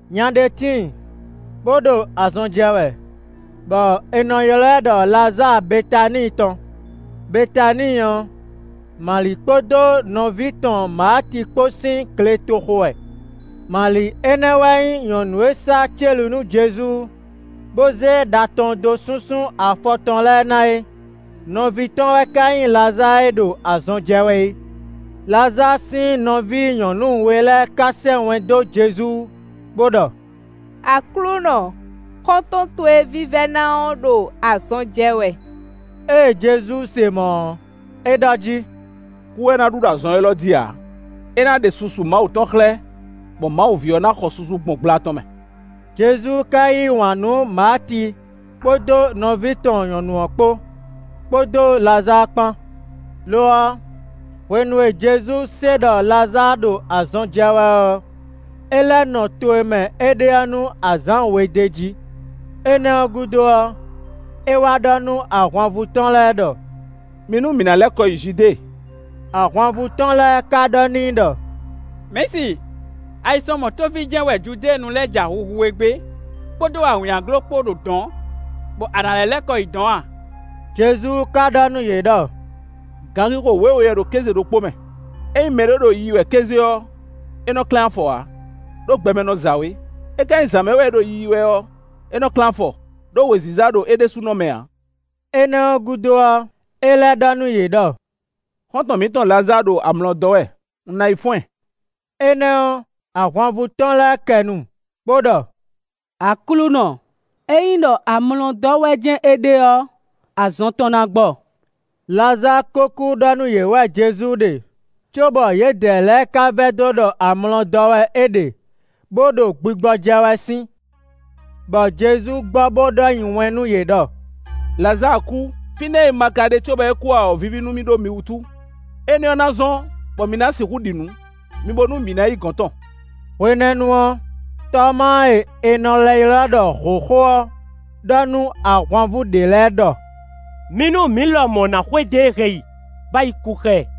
Nya ɖé tíin, bó ɖo azɔn jɛ wɛ, bɔ è nɔ ylɔ́ ɛ ɖɔ Lazáa Betaníi tɔn; Betaníi ɔ́, Mali kpódó nɔví tɔn Maati kpó sín gletoxo wɛ. Mali énɛ́ wɛ nyí nyɔ̌nu e sá célu nú Jezu, bó zé ɖa tɔn dó súnsún afɔ tɔn lɛ́ɛ ná é; nɔví tɔn wɛ ka nyí Lazáa e ɖo azɔn jɛ wɛ é. Lazáa sín nɔví nyɔ̌nu we lɛ́ɛ ka sɛ́ wɛn dó Jezu bó ɖɔ: “Aklúnɔ, xɔ́ntɔn towe vívɛ́ná ɔ́ ɖo azɔn jɛ wɛ.” Ée Jezu se mɔ̌ ɔ́, é ɖɔ jí: “Kú wɛ ná ɖu ɖo azɔn élɔ́ jí ǎ; é ná ɖe susu Mawu tɔn xlɛ́, bɔ Mawu ví ɔ́ ná xɔ susu gbɔn gbla tɔn mɛ.” Jezu ka yí wǎn nú Maati kpódó nɔví tɔn nyɔ̌nu ɔ́ kpó, kpódó Lazáa kpán. Lo ɔ́, hwenu e Jezu se ɖɔ Lazáa ɖo azɔn jɛ wɛ ɔ́, é lɛ́ nɔ to e mɛ é ɖe ɔ́ nú azǎn we d'é jí. Énɛ́ ɔ́ gúdo ɔ́, é wá ɖɔ nú ahwanvú tɔn lɛ́ɛ ɖɔ: “Mi nú mǐ ná lɛ́ kɔ yi Judée.” Ahwanvú tɔn lɛ́ɛ ka ɖɔ n'i ɖɔ: “Mɛ̌si, ayisɔnmɔ tófí jɛ́n wɛ Judéenu lɛ́ɛ ja huhu we gbé kpódó awǐnnyaglo kpó ɖo dɔ̌n, bɔ a nǎ lɛ́ lɛ́ kɔ yi dɔ̌n a?” Jezu ka ɖɔ nú yě ɖɔ: “Ganxixo wěwe wɛ ɖo kéze ɖokpó mɛ; ényí mɛɖé ɖo yiyi wɛ kéze ɔ́, é nɔ klɛ́n afɔ ǎ, ɖó gbɛ mɛ nɔ za wě. É ka nyí zǎn mɛ wɛ é ɖo yiyi wɛ ɔ́, é nɔ klɛ́n afɔ, ɖó wěziza ɖo é ɖésúnɔ mɛ ǎ.” Énɛ́ ɔ́ gúdo ɔ́, é lɛ́ ɖɔ nú yě ɖɔ: “Xɔ́ntɔn mǐtɔn Lazáa ɖo amlɔ dɔ́ wɛ; un ná yi fɔ́n ɛ.” Énɛ́ ɔ́, ahwanvú tɔn lɛ́ɛ kɛ nu bo ɖɔ: “Aklúnɔ, ényí ɖɔ amlɔ dɔ́ wɛ jɛ́n é ɖe ɔ́, azɔn tɔn ná gbɔ.” Lazáa ko kú ɖɔ nú yě wɛ Jezu ɖe, cóbɔ yědɛɛ lɛ́ɛ ka vɛdó ɖɔ amlɔ dɔ́ wɛ é ɖe, bó ɖo gbigbɔ jɛ wɛ sín. Bɔ Jezu gbɔ bo ɖɔ nyi wɛn nú yě ɖɔ: “Lazáa kú; fínɛ́ e un ma ka ɖe cóbɔ é kú ǎ ɔ́ víví nú mì ɖó mi wútu; énɛ́ ɔ́ ná zɔ́n bɔ mi ná sixú ɖi nǔ. Mi bo nú mǐ ná yi gɔ̌n tɔn.” Hwenɛ́nu ɔ́, Tɔmáa e è nɔ lɛ́ ylɔ́ ɖɔ hǒxo ɔ́ ɖɔ nú ahwanvú ɖě lɛ́ɛ ɖɔ: “Mi nú mǐ lɔmɔ̌ ná xwedó e hɛn yi, bó ná yi kú xá ɛ.”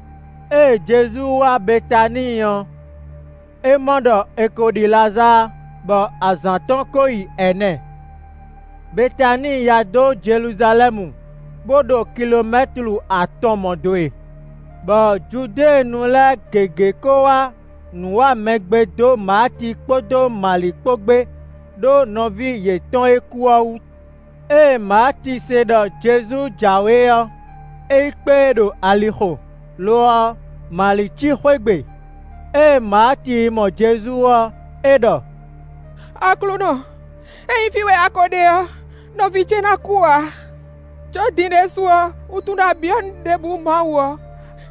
Ée Jezu wá Betaníi ɔ́, é mɔ ɖɔ è ko ɖi Lazáa, bɔ azǎn tɔn ko yi ɛnɛ. Betaníi yá dó Jeluzalɛ́mu bó ɖo kilomɛ́tlu atɔn mɔ̌ dó e. Bɔ Judéenu lɛ́ɛ gěgé ko wá nǔwamɛgbe dó Maati kpódó Mali kpó gbé ɖó nɔví yětɔn e kú ɔ́ wú. Ée Maati se ɖɔ Jezu jǎwe ɔ́, é yi kpé e ɖo alixo; lo ɔ́, Mali cí xwé gbe. Ée Maati yi mɔ Jezu ɔ́, é ɖɔ: “Aklúnɔ, ényí fí wɛ a ko ɖe ɔ́, nɔví ce ná kú ǎ. Có din ɖésú ɔ́, un tunwun ɖɔ a byɔ́ nǔ ɖěbǔ Mawu ɔ́,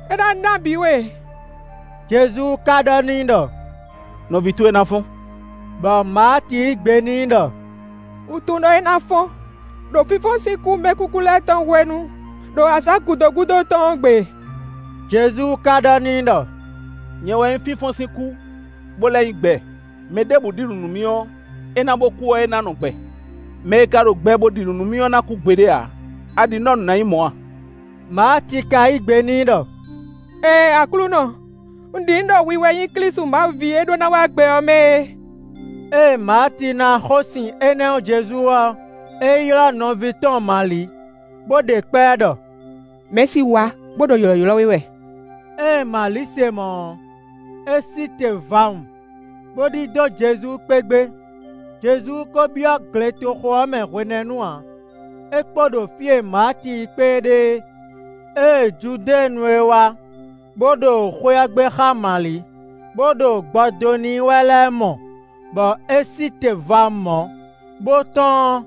é ná ná bǐ we.” Jezu ka ɖɔ n'i ɖɔ: “Nɔví towe ná fɔ́n.” Bɔ Maati yí gbe n'i ɖɔ: “Un tunwun ɖɔ é ná fɔ́n ɖo fínfɔ́n sín kú mɛkúkú lɛ́ɛ tɔn hwenu, ɖo azǎn gǔdo gúdo tɔn ɔ́ gbe.” Jezu ka ɖɔ n'i ɖɔ: “Nyɛ wɛ nyí fínfɔ́n sín kú, bo lɛ́ nyí gbɛ; mɛ ɖěbǔ ɖi nǔ nú mì ɔ́, é ná bo kú ɔ́, é ná nɔ gbɛ. Mɛ e ka ɖo gbɛ bo ɖi nǔ nú mì ɔ́ ná kú gbeɖé ǎ. A ɖi nǔ ɖɔ nǔ ná nyí mɔ̌ a?” Maati ka yí gbe n'i ɖɔ: “Ɛɛn Aklúnɔ, un ɖi nǔ ɖɔ hwi wɛ nyí Klísu Mawu ví e ɖó ná wá gbɛ ɔ́ mɛ é.” Ée Maati ná xósin énɛ́ ɔ́ Jezu ɔ́, é yi ylɔ́ nɔví tɔn Mali bó ɖe kpá ɛ ɖɔ: “Mɛ̌si wá bo ɖo ylɔ̌ylɔ́ we wɛ.” Ée Mali se mɔ̌ ɔ́, é sí te vawun, bo ɖidó Jezu kpé gbé. Jezu ko byɔ́ gletoxo ɔ́ mɛ hwenɛ́nu ǎ, é kpo ɖo fí e Maati yi kpé e ɖe é. Ée Judéenu e wá bo ɖo xwé ɔ́ gbé xá Mali, bo ɖo gbɔ dó n'i wɛ lɛ́ɛ mɔ bɔ é sí te vawun mɔ̌ bo tɔ́n ɔ́,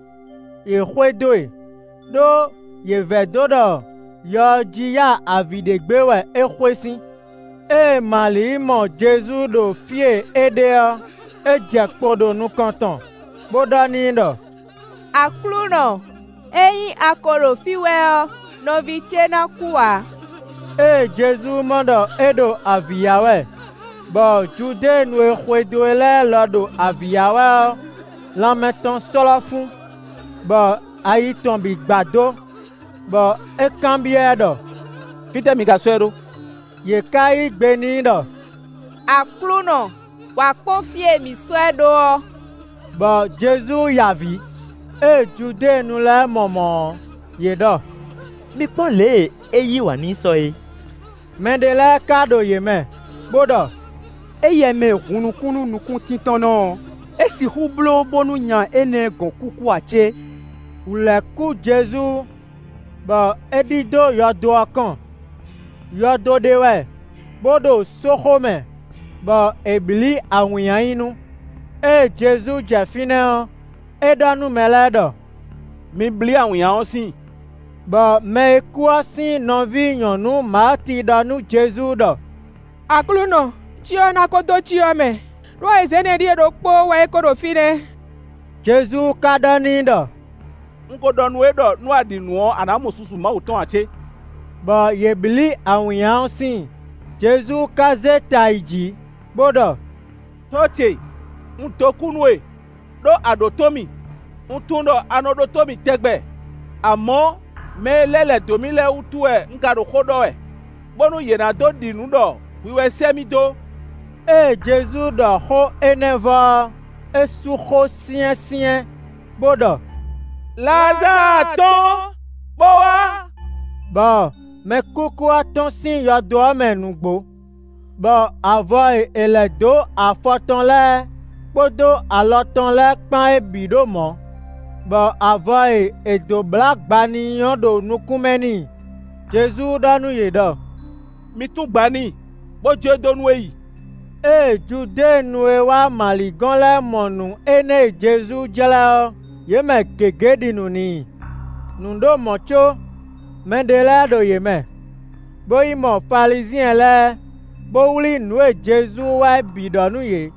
yě xwedó e, ɖó yě vɛdó ɖɔ yɔ ɔ́ jí ya avǐ ɖe gbé wɛ é xwe sín. Ée Mali yi mɔ Jezu ɖo fí e é ɖe ɔ́, é jɛ kpo ɖo nukɔn tɔn, bó ɖɔ n'i ɖɔ: “Aklúnɔ, ényí a ko ɖo fí wɛ ɔ́, nɔví ce ná kú ǎ.” Ée Jezu mɔ ɖɔ é ɖo avǐ ya wɛ, bɔ Judéenu e xwedó e lɛ́ɛ lɔ ɖo avǐ ya wɛ ɔ́, lanmɛ tɔn slɔ́ fún, bɔ ayi tɔn bǐ gbadó; bɔ é kanbyɔ́ ɛ ɖɔ: “Fítɛ́ mi ka sɔ́ ɛ ɖó?” Yě ká yí gbe n'i ɖɔ: “Aklúnɔ, wǎ kpɔ́n fí e mǐ sɔ́ ɛ ɖó ɔ́.” Bɔ Jezu ya avǐ. Ée Judéenu lɛ́ɛ mɔ mɔ̌ ɔ́, yě ɖɔ: “Mi kpɔ́n lě e é yí wǎn n'i sɔ é.” Mɛ ɖé lɛ́ɛ ka ɖo yě mɛ bó ɖɔ: “Éyɛ́ mɛ e hun nukún nú nukúntíntɔ́nnɔ ɔ́, é sixú bló bónú nya énɛ́ gɔn kúkú ǎ cé?” Wǔ lɛ́ kú Jezu, bɔ é ɖidó yɔdo ɔ́ kɔn; yɔdo ɖé wɛ bó ɖo sóxo mɛ bɔ è blǐ awǐnnya nyi nu. Ée Jezu jɛ fínɛ́ ɔ́, é ɖɔ nú mɛ lɛ́ɛ ɖɔ: “Mi blí awǐnnya ɔ́ síin.” Bɔ mɛ e kú ɔ́ sín nɔví nyɔ̌nu Maati ɖɔ nú Jezu ɖɔ: “Aklúnɔ, cyɔ ɔ́ ná ko dó cyɔ mɛ! Đó azǎn ɛnɛ ɖíe ɖokpóó wɛ é ko ɖo fínɛ́.” Jezu ka ɖɔ n'i ɖɔ: “Un ko ɖɔ nú we ɖɔ nú a ɖi nǔ ɔ́, a ná mɔ susu Mawu tɔn ǎ cé?” Bɔ yě blí awǐnnya ɔ́ síin. Jezu ka zé ta yi jǐ, bó ɖɔ: “Tɔ́ ce, un dó kú nú we, ɖó a ɖǒtó mì. Un tunwun ɖɔ a nɔ ɖótó mì tɛgbɛ; amɔ̌, mɛ e lɛ́ lɛ̌ dó mì lɛ́ɛ wútu wɛ un ka ɖo xó ɖɔ wɛ bónú yě ná dó ɖi nǔ ɖɔ hwi wɛ sɛ́ mì dó.” Ée Jezu ɖɔ xó énɛ́ vɔ ɔ́, é sú xó syɛ́nsyɛ́n bo ɖɔ: “Lazáa tɔ́n, bó wá.” Bɔ mɛkúkú ɔ́ tɔ́n sín yɔdo ɔ́ mɛ nǔgbó, bɔ avɔ e è lɛ̌ dó afɔ tɔn lɛ́ɛ kpódó alɔ tɔn lɛ́ɛ kpán é bǐ ɖo mɔ̌, bɔ avɔ e è dǒ blǎ gba n'i ɔ́ ɖo nukún mɛ n'i. Jezu ɖɔ nú yě ɖɔ: “Mi tún gba n'i, bo jó e dó nú é yi.” Ée Judéenu e wá Mali gɔ́n lɛ́ɛ mɔ nǔ énɛ́ e Jezu jlɛ́ ɔ́, yě mɛ gěgé ɖi nǔ n'i. Nǔ ɖo mɔ̌ có mɛɖé lɛ́ɛ ɖo yě mɛ, bó yi mɔ Falizyɛn lɛ́ɛ, bó wlí nǔ e Jezu wa é bǐ ɖɔ nú yě.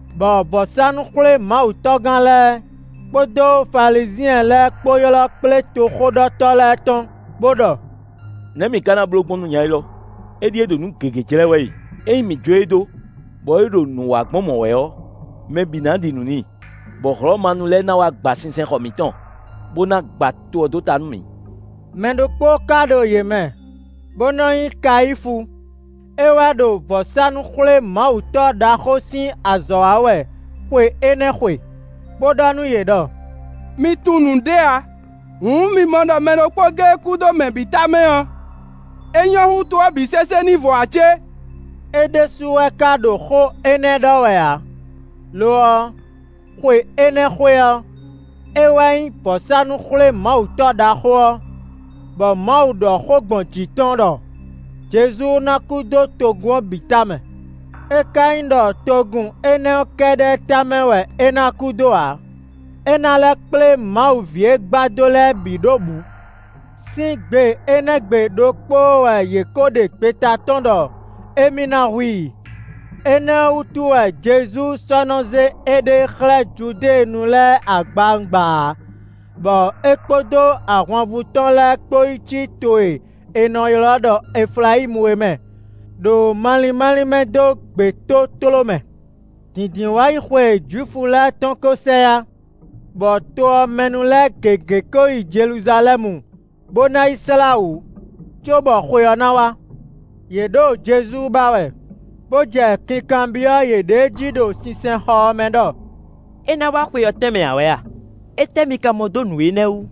Bɔ vɔ̌sánú-xwlémawutɔ́gán lɛ́ɛ kpódó Falizyɛn lɛ́ɛ kpó ylɔ́ kplé toxóɖɔtɔ́ lɛ́ɛ tɔn, bó ɖɔ: “Nɛ̌ mǐ ká ná bló gbɔn nú nya élɔ́? Éɖíe ɖo nǔ gěgé jlɛ́ wɛ e. Ényí mǐ jó e dó, bɔ é ɖo nǔ wa gbɔn mɔ̌ wɛ ɔ́, mɛ bǐ ná ɖi nǔ n'i, bɔ Hlɔ̌manu lɛ́ɛ ná wá gba sinsɛnxɔ mǐtɔn, bó ná gba to ɔ́ dó ta nú mǐ.” Mɛ ɖokpó ka ɖo yě mɛ, bó nɔ́ nyí Kayífu; é wɛ ɖo vɔ̌sánú-xwlémawutɔ́ ɖaxó sín azɔ̌ wa wɛ xwe énɛ́ xwe, bó ɖɔ nú yě ɖɔ: “Mi tunwun nǔɖé ǎ. Hǔn mi mɔ ɖɔ mɛ ɖokpó géé kú dó mɛ bǐ tamɛ ɔ́, é nyɔ́ hú to ɔ́ bǐ sésé ní vɔ ǎ cé?” É ɖésú wɛ ka ɖo xó énɛ́ ɖɔ wɛ ǎ; lo ɔ́, xwe énɛ́ xwe ɔ́, é wɛ nyí vɔ̌sánú-xwlémawutɔ́ ɖaxó ɔ́, bɔ Mawu ɖɔ xó gbɔn jǐ tɔn ɖɔ Jezu ná kú dó togun ɔ́ bǐ tamɛ. É ka nyí ɖɔ togun énɛ́ ɔ́ kɛ́ɖɛ́ tamɛ wɛ é ná kú dó ǎ; é ná lɛ́ kplé Mawu ví e gbadó lɛ́ɛ bǐ ɖó bǔ. Sín gbe énɛ́ gbe ɖokpóó wɛ yě ko ɖe gbeta tɔ́n ɖɔ émí ná hu i. Énɛ́ ɔ́ wútu wɛ Jezu sɔ́ nɔ zé éɖée xlɛ́ Judéenu lɛ́ɛ agbawungba ǎ, bɔ é kpódó ahwanvú tɔn lɛ́ɛ kpó yi cí to e è nɔ ylɔ́ ɖɔ Eflayímu é mɛ, ɖo malín málín mɛ dó gbětótló mɛ. Dǐndínwáyixwe Jwifu lɛ́ɛ tɔn ko sɛ yá; bɔ to ɔ́ mɛ nu lɛ́ɛ gěgé ko yi Jeluzalɛ́mu bó ná yi slá wǔ, cóbɔ xwe ɔ́ ná wá. Yě ɖo Jezu ba wɛ, bó jɛ kinkanbyɔ́ yěɖée jí ɖo sinsɛnxɔ ɔ́ mɛ ɖɔ: “É ná wá xwe ɔ́ tɛnmɛ ǎ wɛ a? Étɛ́ mi ka mɔ dó nǔ énɛ́ wú?”